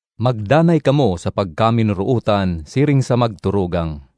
Magdanay kamo sa pagkaminorootan siring sa magturugang.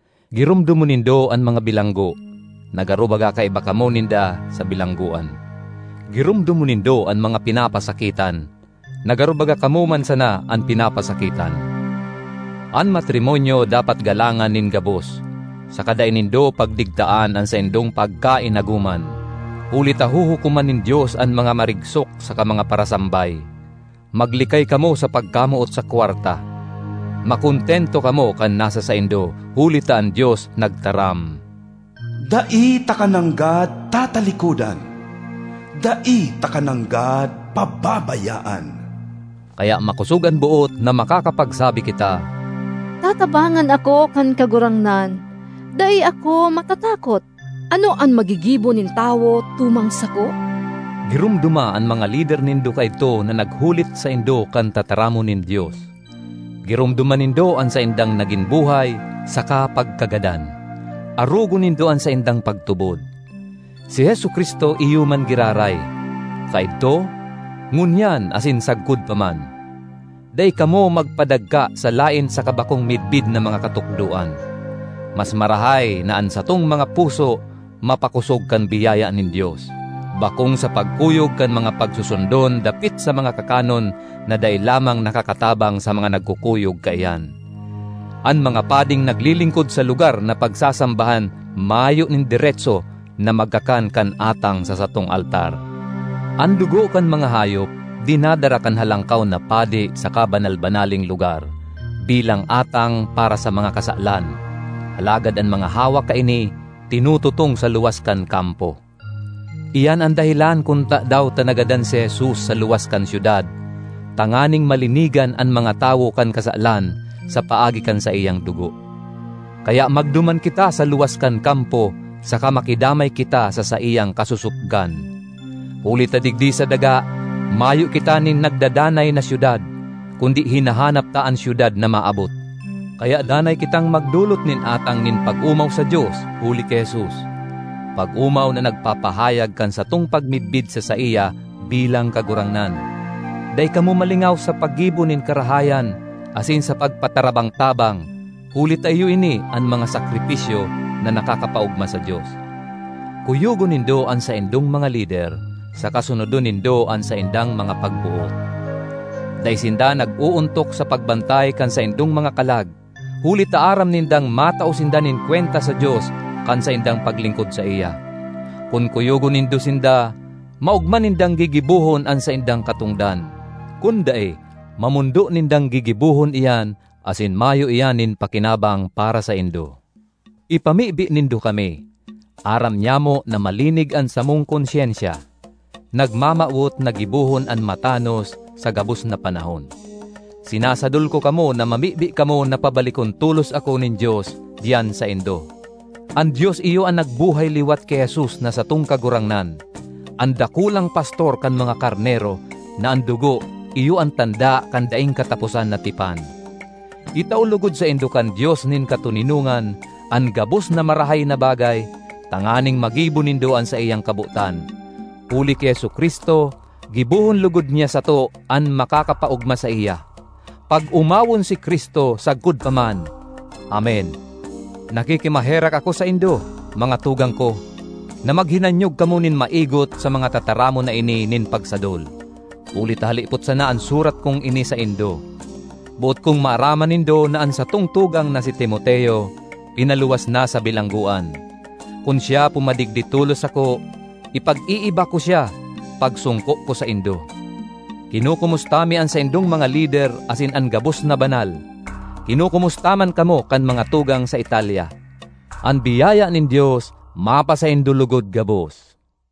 Giromdomon nindo an mga bilanggo, na garo baga kaiba kamo ninda sa bilanggoan. Giromdomon nindo an mga pinapasakitan, na garo baga kamo man sana an pinapasakitan. An matrimonyo dapat galangan nin gabos, saka dai nindo pagdigtaan an saindong pagkainagoman; huli ta huhukoman nin Dios an mga marigsok saka mga parasambay. Maglikay kamo sa pagkamoot sa kwarta; makontento kamo kan nasa saindo, huli ta an Dios nagtaram, “Dai taka nanggad tatalikodan; dai taka nanggad pababayaan.” Kaya makosog an boot na makakapagsabi kita, “Tatabangan ako kan Kagurangnan; dai ako matatakot. Ano an magigibo nin tawo tumang sako?” Giromdoma an mga lider nindo kaidto na naghulit saindo kan tataramon nin Dios. Giromdoma nindo an saindang nagin buhay saka pagkagadan; arogon nindo an saindang pagtubod. Si Jesu-Cristo iyo man giraray; kaidto, ngunyan asin sagkod pa man. Dai kamo magpadagka sa laen saka bakong midbid na mga katukdoan. Mas marahay na an satong mga puso mapakosog kan biyaya nin Dios, bakong sa pagkuyog kan mga pagsusundon dapit sa mga kakanon na dai lamang nakakatabang sa mga nagkukuyog kaiyan. An mga pading naglilingkod sa lugar na pagsasambahan mayo nin deretso na magkakan kan atang sa satong altar. An dugo kan mga hayop dinadara kan Halangkaw na Padi sa Kabanal-banaleng Lugar bilang atang para sa mga kasalan, alagad an mga hawak kaini tinututong sa luwas kan kampo. Iyan an dahelan kun tadaw ta nagadan si Jesus sa luwas kan syudad tanganing malinigan an mga tawo kan kasalan sa paagi kan saiyang dugo. Kaya magduman kita sa luwas kan kampo saka makidamay kita sa saiyang kasosopgan. Huli ta digdi sa daga mayo kita nin nagdadanay na syudad, kundi hinahanap ta an syudad na maabot. Kaya danay kitang magdolot nin atang nin pag-omaw sa Dios huli ki Jesus, pag-omaw na nagpapahayag kan satong pagmidbid sa saiya bilang Kagurangnan. Dai kamo malingaw sa paggibo nin karahayan asin sa pagpatarabang-tabang, huli ta iyo ini an mga sakripisyo na nakakapaogma sa Dios. Kuyogon nindo an saindong mga lider saka sunodon nindo an saindang mga pagboot. Dai sinda nag-oontok sa pagbantay kan saindong mga kalag, huli ta aram nindang matao sinda nin kwenta sa Dios kan saindang paglingkod saiya. Kun kuyogon nindo sinda, maogma nindang gigibohon an saindang katongdan; kun dai, mamondo nindang gigibohon iyan asin mayo iyan nin pakinabang para saindo. Ipamibi nindo kami. Aram nyamo na malinig an samong konsyensya, nagmamawot na gibohon an matanos sa gabos na panahon. Sinasadol ko kamo na mamibi kamo na pabalikon tolos ako nin Dios diyan saindo. An Dios iyo an nagbuhay liwat ki Jesus na satong Kagurangnan, an Dakulang Pastor kan mga karnero, na an dugo iyo an tanda kan daing kataposan na tipan. Itao logod saindo kan Dios nin katoninongan an gabos na marahay na bagay tanganing magibo nindo an saiyang kabotan; huli ki Jesu-Cristo, gibohon logod niya sato an makakapaogma saiya. Pag-omawon si Cristo sagkod pa man! Amen. Nakikimaherak ako saindo, mga tugang ko, na maghinanyog kamo nin maigot sa mga tataramon na ini nin pagsadol; huli ta halipot sana an surat kong ini saindo. Boot kong maaraman nindo na an satong tugang na si Timoteo pinaluwas na sa bilanggoan. Kun siya pumadigdi tolos sako, ipag-iiba ko siya pagsongko ko saindo. Kinokomusta mi an saindong mga lider asin an gabos na banal. Kinokomusta man kamo kan mga tugang sa Italia. An biyaya nin Dios mapasaindo logod gabos.